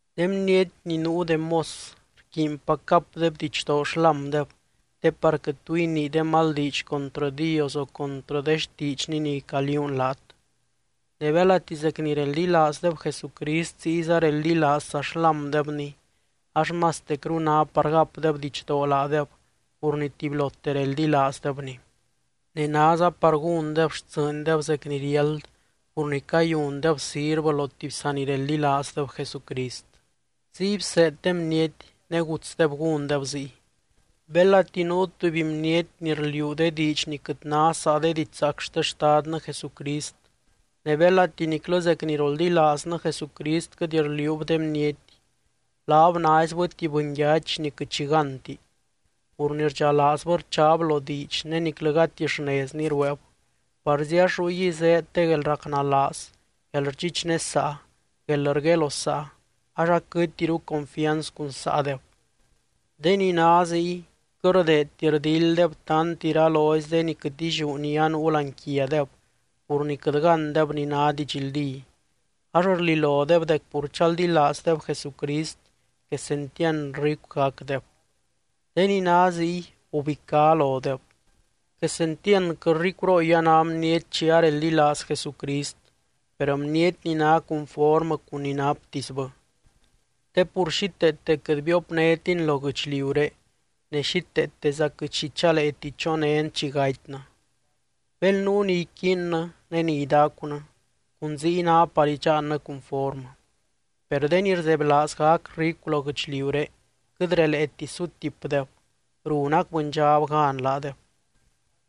De bniety ni nuu de mos rquiinpac gapdeb didxdoo xlámdeb te par quɨt tu inii de mal diidx contrɨ Dios o contrɨ de xtiidxny ni caliuun laat. Ne belati zec ni reldilaazdeb Jesucrist ziyza reldilaazza xlámdebny, ax mastecru ná par gapdeb didxdoo laadeb pur ni tubylote reldilaazdebny. Ne náza par gúndeb xtsɨɨndeb zec ni riáld pur ni cayundeb sirvɨ lo tuby sanireldilaazdeb Jesucrist. Ziy bseed de bniety, ne gutsdeb gúndeb ziy. Belati nuu tuby bniety ni rliuu de diidx ni quɨt ná saa de didxzaac xte Xtadnɨ Jesucrist ne belati niclɨ zec ni roldilaaznɨ Jesucrist quɨt rliuub de bniety, laab naizbɨ tuby bɨnyachy ni quɨt xi gánti. Pur ni rdxalaazbɨ rchaab lo diidx ne niclɨ gati xnezni rueeb, parzi ax ruygui zéed de guelracnalaaz, guelrdxichnesaa, guelrguelosaa ax aquɨtiru confianz cun saadeb. De ni ná ziy quɨt rdeedti rdilddeb tant iralozy de ni quɨt illiú ni anuu láani quiadeb pur ni quɨt gándeb ni ná didxldí, ax rlilodeb dec pur chaldilaazdeb Jesucrist quesentiand ricu gacdeb. De ni ná ziy, gubicá lodeb. Quesentiandquɨ ricurooy a ná bniety chi areldilaaz Jesucrist, per bniety ni ná cunformɨ cun ni naptisbɨ. Te pur xíteete quɨt biopnétin lo guɨchliuré ne xíteeteza quɨt xi chaleeti chonén chi gatynɨ. Bel nuu ni iquiinnɨ ne ni idacunɨ cun ziy ná par idxaannɨ cunformɨ. Per de ni rzebylaaz gac ricu lo guɨchliuré quɨt releeti sutipdeb, runac bɨndxab gan laadeb.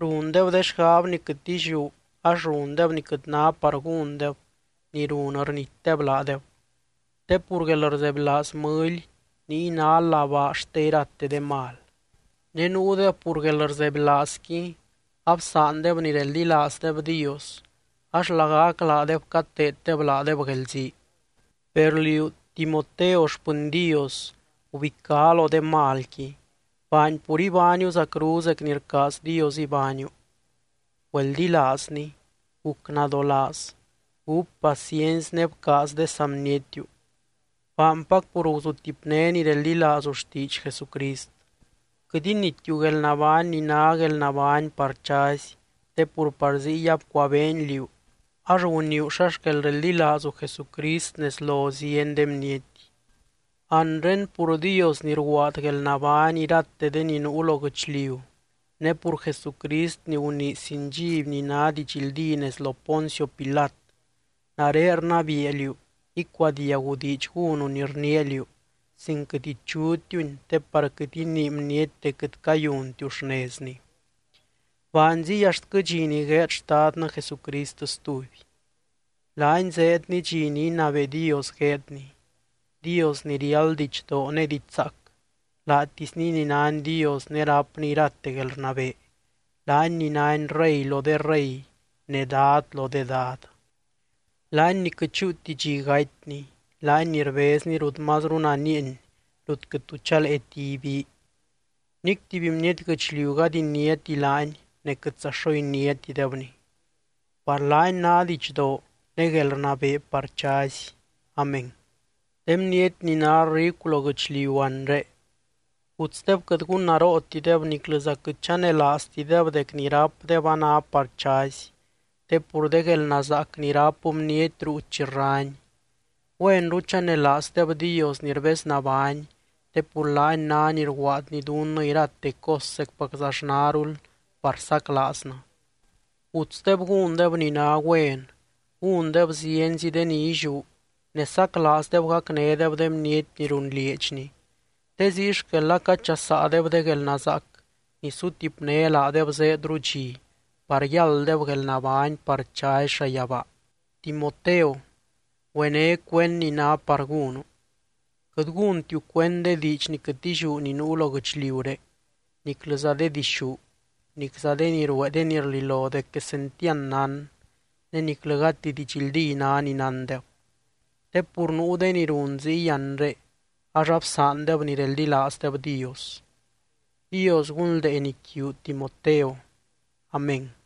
Rundeb de xgab ni quɨt illiú ax rundeb ni quɨt ná par gúndeb ni run rnitdeb laadeb. Te pur guelrzebylaaz mɨly niy ná labaa xte irate de mal. Ne nuudeb pur guelrzebylaazqui, absaandeb ni reldilaazdeb Dios ax lagac laadeb cateeddeb laadeb guelzii. Per liú, Timoteo xpɨny Dios, gubicá lo de malqui. Baany pur ibániu zacru zec ni rcaaz Dios ibániu, güeldilaazny, guc nadolaaz, gúp paciency ne bcaaz de saa bnietiu. Baanpac pur guzutipné ni reldilaazu xtiidx Jesucrist. Quɨt initiu guelnabány ni ná guelnabány par chazy, te pur par ziy abcuabeeny liú ax guniiu xa xquel reldilaazu Jesucrist nez lo zieny de bniety. Anre, pur Dios ni rguaad guelnabány irate de ni nuu lo guɨchliu, ne pur Jesucrist ni gunii sin dxiby ni ná didxldí nez lo Poncio Pilat, nare rnabiia liú icuadiagu diidx gúnu ni rniia liú, sin quɨt ichutiuni te par quɨt inii bniety dec quɨt cayuntiu xnezni. Baany ziy axtquɨ dxi ni gueed Xtadnɨ Jesucrist stuby. Laany zeedny dxi ni inabee Dios gueedny, Dios ni riáld didxdoo ne diidx zaac, laatisny ni nány Dios ne rápny irate guelrnabee, laany ni nány Rey lo de rey ne Dad lo de dad. Laany ni quɨt chúuti dxi gatyny, laany ni rbezny rut mazru nanieeny rut quɨt tu chaleeti ibii. Nic tuby bniety guɨchliu gady iniáti laany ne quɨtza xo iniátidebny. ¡Par laany ná didxdoo ne guelrnabee par chazy! Amén. De bniety ni ná ricu lo guɨchliu anre, gutsdeb quɨt gunnarootideb niclɨza quɨt chanelaaztideb dec ni rápdeb a ná par chazy, te pur de guelnazaac ni ráp bniety ruu chi rrany. Güenru chanelaazdeb Dios ni rbeznabány te pur laany ná ni rguaadny dunnɨ irate cos zecpaczaxnarul par saclaaznɨ. Gutsdeb gúndeb ni ná güen, gúndeb zienzi de ni illiú ne saclaazdeb gacnédeb de bniety ni runlieedxni. Te ziy xquel acachasaadeb de guelnazaac ni sutipné laadeb zéedru dxi par yálddeb guelnabány par chazy llayabaa. Timoteo, güené cuend ni ná par gúnu. Quɨt gúntiu cuend de diidx ni quɨt illiú ni nuu lo guɨchliuré niclɨza de dixú, nicza de ni ruee de ni rlilo dec quesentiand nán ne niclɨ gati didxldí ná ni nándeb. Te pur nuu de ni run ziy anre, ax absaandeb ni reldilaazdeb Dios. Dios gunldeeny quiu, Timoteo. Amén.